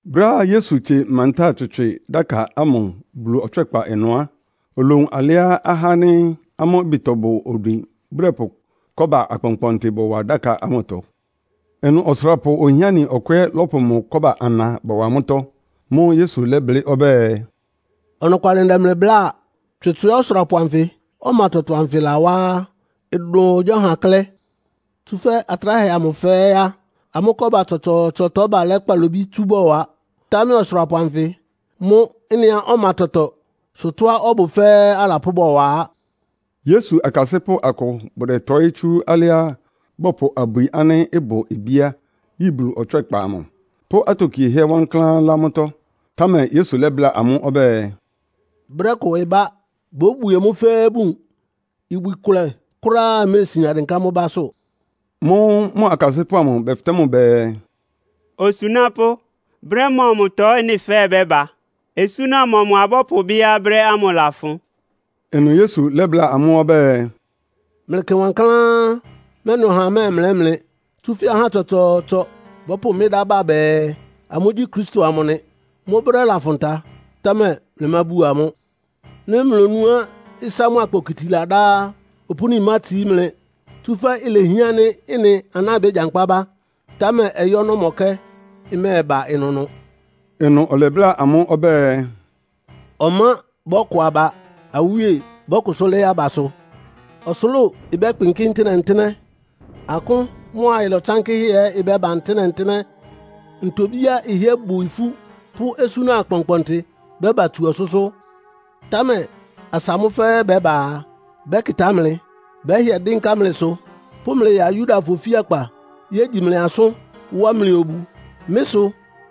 Brɛ́á Yesu tsie mantáa tswɩtswɩ dáka ámʋ Bulu ɔtswɛ́kpa ɩnʋ á, olowun alɩá ahá ánɩ́ amʋ́ ɩbɩtɔ bʋ odwin bʋdɛpʋ kɔ́ba akpɔnkpɔntɩ bɔwa dáka ámʋtɔ. Ɩnʋ ɔsʋrapʋ ohiáni ɔkʋ ɛ́ lɔ́pʋ mʋ kɔ́ba ana bɔwa mʋ́tɔ́. Mʋ́ʋ́ Yesu lɛ́blɩ́ ɔbɛ́ɛ, “Ɔnɔkwalɩ ndɛ mlɩ bláa, tswɩtswɩá ɔsʋrapʋ anfɩ, ɔma tɔtɔ anfɩ lawá á, ɩdʋn ɔhagyíɔha klɛ́. Tsúfɛ́ atráhɛ amʋ fɛ́ɛ́ á, amʋ́ kɔ́ba tsɔtsɔɔtsɔtɔ balɛ́ kpalobí tsú bɔwa. Támɛ ɔsʋrapʋ anfɩ mʋ́ ɩ́nɩá ɔma tɔtɔ sʋ tɔ́á ɔbʋ fɛ́ɛ́ alapʋ́ bɔwa á.” Yesu akasɩ́pʋ́ akʋ bʋdɛtɔɩ́ tsú alɩá bɔpʋ abwi ánɩ́ ɩbʋ bíá yi Bulu ɔtswɛ́kpa amʋ, pʋ́ atokiehɛ́ wankláán lá mʋ́tɔ́. Támɛ Yesu lɛ́bláa amʋ́ ɔbɛ́ɛ, “Brɛ́ kʋ ɩbá, bóbwie mʋ́ fɛ́ɛ́ bun. Ibwi kʋlɛ kʋ́ráá méesian dɩnká mʋ́ básʋ́.” Mʋ́ʋ́ mʋ akasɩ́pʋ́ amʋ bɛfɩtɛ́ mʋ bɛɛ, “Osunápʋ́, brɛ́ mɔmʋtɔ ɩ́nɩ fɛ́ɛ́ bɛ́ba? Osúna mɔmʋ abɔ́pʋbɩ́á brɛ́ ámʋ ɩlafʋn?” Ɩnʋ Yesu lɛ́bláa amʋ́ ɔbɛ́ɛ, “Mlɩkɩ wankláán, mɛ́nɩ ɔhaa mɛ́ɛmlɛ́ mlɩ. Tsúfɛ́ ahá tsɔtsɔɔtsɔ bɔ́pʋ mɩ́ dá ba bɛɛ, amʋ́gyí Kristo amʋ nɩ. Mʋ́ brɛ́ lafʋn ta, támɛ mlɩmábuo amʋ́. Nɩ́ mlonúá ɩsá mʋ́a kpokiti ladá á, opúni mátsií mlɩ. Tsúfɛ́ ilehián ánɩ́ ɩ́nɩ aná bégyankpá bá, támɛ ɔyɩ́ ɔnɔ́mɔkɛ́ ɩmɛ́ɛba ɩnʋnʋ.” Ɩnʋ ɔlɛbláa amʋ́ ɔbɛ́ɛ, “Ɔmá bɔ́kɔ aba. Awíe bɔ́kʋsʋ́ lɩ́ɩ́ abasʋ. Ɔsʋlʋ́ʋ ɩbɛ́kpɩnkɩ́ ntɩ́nɛ́-ntɩ́nɛ́. Akʋ́n mʋ́a ɩlɔ tsánkɩ́hɛ́ ɛ́ bɛ́ba ntɩ́nɛ́-ntɩ́nɛ́. Ntobíá ɩhɩ́ɛ́ bʋ ifú pʋ́ osúna akpɔnkpɔntɩ bɛ́ba tsú ɔsʋ́sʋ́. Támɛ asa mʋ́ fɛ́ɛ́ bɛ́ba a, bɛ́kɩtá mlɩ, bɛ́hɩɛ dɩ́nká mlɩsʋ, pʋ́ mlɩ ya Yudafɔ ofíakpa yégyi mlɩ asʋ́n, wá mlɩ obu. Mɩ́ sʋ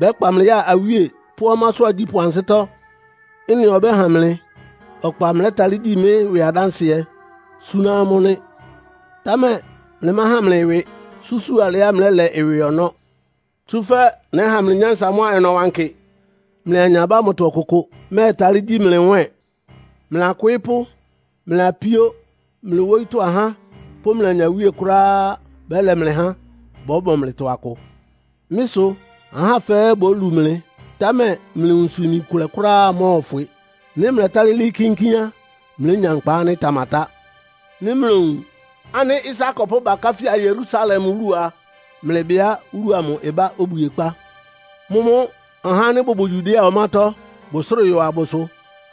bɛ́kpa mlɩ ya awíe pʋ́ ɔmásʋ́ agyípʋ́ ansɩ́tɔ́. Ɩ́nɩ ɔbɛ́ha mlɩ ɔkpa mlɛ́talɩ́ gyi mɩ́ ɩwɩ adánsɩɛ súná amʋ́ nɩ́. Támɛ mlɩmáhan mlɩ ɩwɩ susúu alɩá mlɛ́lɛ ɩwɩ ɔnɔ́. Tsúfɛ́ nɛ́ha mlɩ nyánsa mʋ́a ɔnɔwankɩ, mlɩ anyabá ámʋtɔ ɔkʋkʋ mɛ́ɛtalɩ́ gyi mlɩ nwɛ́ɛn. Mlɩ akwɩɩ́pʋ́, mlɩ apíó, mlɩ wóyítɔ́ ahá pʋ́ mlɩ anyawíe kʋ́ráá bɛ́lɛ mlɩ há, bɔ́mɔ mlɩtɔ akʋ. Mɩ́ sʋ ahá fɛ́ɛ́ bólu mlɩ. Támɛ mlɩ nwunsʋ-imi kʋlɛ kʋ́ráá mɔ́ɔfwɩ. Nɩ́ mlɛtálɩ́ lɩ́ɩ́ kínkín á, mlénya nkpa ánɩ́ ɩtamatá. “Nɩ́ mlowun ánɩ́ ɩsá akɔpʋ́ bakáfía Yerusalem wúlu a, mlɩbɩá wúlu amʋ ɩbá obwiekpá. Mʋ́mʋ́ ahá ánɩ́ bʋbʋ Yudea ɔmátɔ́ bʋsrɩ́ɩ yɔ abʋsʋ.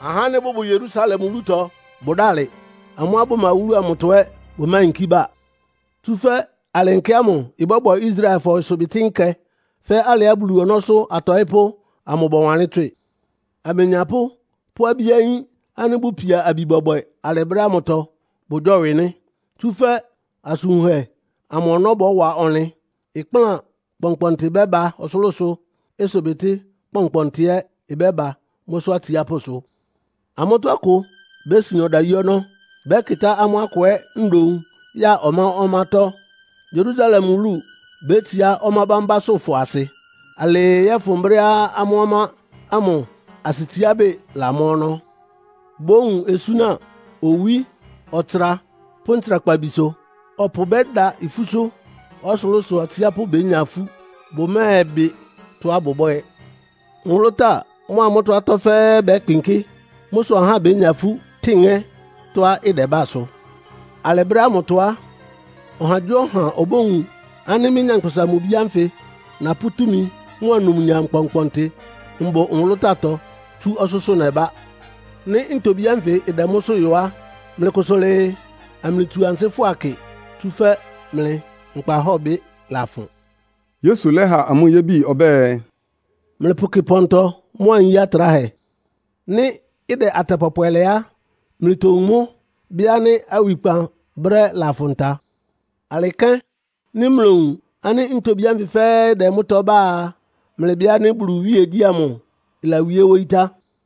Ahá ánɩ́ bʋbʋ Yerusalem wúlutɔ bʋdálɩ. Amʋ́á bʋma wúlu amʋtɔ ɛ́ bʋmáyinkí ba. Tsúfɛ́ alɩ nkɛ ámʋ ɩbɔ́bwɛ Israelfɔ ɩsʋbɩtɩ́ nkɛ fɛ́ alɩá Bulu ɔnɔ́sʋ́ atɔɩ́pʋ́ amʋ bɔwanlɩ́n tswɩ. Amenyapʋ́ pʋ́ abí ayín ánɩ́ bʋpia abi bɔbwɛ alɩ brɛ́ ámʋtɔ, bʋgyɔ́wɩ nɩ́. Tsúfɛ́ asʋn wunhɛ amʋ ɔnɔ́ bɔ́wa ɔnlɩn. Ɩkplán kpɔnkpɔntɩ bɛ́ba ɔsʋlʋ́sʋ, ɩsʋbɩtɩ́ kpɔnkpɔntɩ ɛ́ ɩbɛ́ba mʋ́sʋ́ atsiápʋ́sʋ. Amʋ́tɔ́ akʋ bésin ɔdayí ɔnɔ́. Bɛ́kɩtá amʋ́ akʋ ɛ́ ndoun ya ɔmá-ɔmátɔ́. Yerusalem wúlu bétsiá ɔmá bámbásʋ́fɔ asɩ, alɩɩ yɔ́fʋn brɛ́á amʋ́ ɔmá ámʋ asɩtsiábɩ́ lamɔ́ ɔnɔ́. “Bówun osúna owí, ɔtsra pʋ́ ntsrakpabisʋ. Ɔpʋ bɛ́da ifúsʋ́. Ɔsʋlʋ́sʋ atsiápʋ́ bénya ifú, bʋmɛ́ɛbɩ tɔ́á bʋbwɛ́ɛ. Nwʋlʋ́táa mʋ́a mʋ́tɔ́ atɔ́ fɛ́ɛ́ bɛ́kpɩnkɩ́. Mʋ́ sʋ ahá bénya ifú, tɩ́ɩn ŋɛ́ tɔ́á ɩdɛbá sʋ. Alɩ brɛ́ ámʋtɔ á, ɔhagyíɔha obówun ánɩ́ mɩ́, Nyankpʋsa-Mʋ-Bi ánfɩ napʋ́ túmi mʋ́a numnyam kpɔnkpɔntɩ mbʋ nwʋlʋ́táatɔ tsú ɔsʋ́sʋ́ nɛbá. Nɩ́ ntobí ánfɩ ɩdɛ mʋ́sʋ́ yɔ á, mlɩkʋsʋ lɩɩ, amlɩtsu ansɩ́ fʋa kɩ, tsúfɛ́ mlɩ nkpahɔ́bɩ lafʋn.” Yesu lɛ́ha amʋ́ yébi ɔbɛ́ɛ, “Mlɩpʋkɩ pɔntɔ mʋ́a nyí atráhɛ. Nɩ́ ɩdɛ atɛ pɔpwɛ lɛ á, mlɩtowun mʋ́, bɩ́ ánɩ́ awikpan brɛ́ lafʋn ta. Alɩ kɛ́n, nɩ́ mlowun ánɩ́ ntobí ánfɩ fɛ́ɛ́ ɩdɛ mʋ́tɔ́ bá a, mlɩbɩ ánɩ́ Bulu iwíegyí ámʋ ɩlawíé wóyí tá.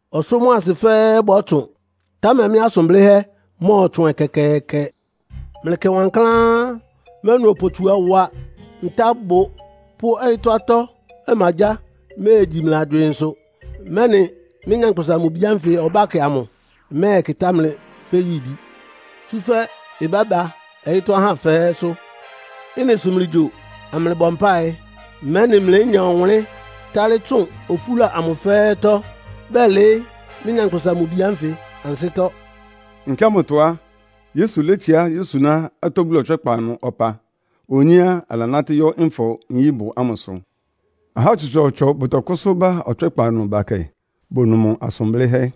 Ɔsʋ́ mʋ́a asɩ fɛ́ɛ́ bɔ́tsʋn, támɛ mɩ́ asʋn blɩ́hɛ́ mɔ́ɔtsʋn ɛkɛkɛɛkɛ. “Mlɩkɩ wankláán, mɛ́nɩ opotsuawa, ntábʋ pʋ́ ɔyɩ́tɔ́ atɔ́ ɔmagyáa méegyi mlɩ agywɩɩnsʋ, mɛ́nɩ mɩ́, Nyankpʋsa-Mʋ-Bi ánfɩ ɔbákɛ amʋ mɛ́ɛbɛkɩtá mlɩ fɛ́ yibi. Tsúfɛ́ ɩbɛ́ba ɔyɩ́tɔ́ ahá fɛ́ɛ́sʋ́. Ɩ́nɩ sʋ mlɩgyo, amlɩbɔ mpáɩ, mɛ́nɩ mlénya ɔwʋnlɩ́n tálɩ́ tsʋn ofúla amʋ fɛ́ɛ́tɔ́, bɛlɩɩ́ mɩ́, Nyankpʋsa-Mʋ-Bi ánfɩ ansɩ́tɔ́.” Nkɛ ámʋtɔ á, Yesu létsiá yósuná atɔ́ Bulu ɔtswɛ́kpa ɩnʋ ɔpa. Onyé á, alanátɩ́ yɔ́ Nfɔ-nyíbʋ ámʋsʋ. Ahá tsɔtsɔɔtsɔ bʋtɔkʋ́sʋ́ ba Ɔtswɛ́kpa ɩnʋ bakɛ, bonu mʋ asʋn blɩ́hɛ́.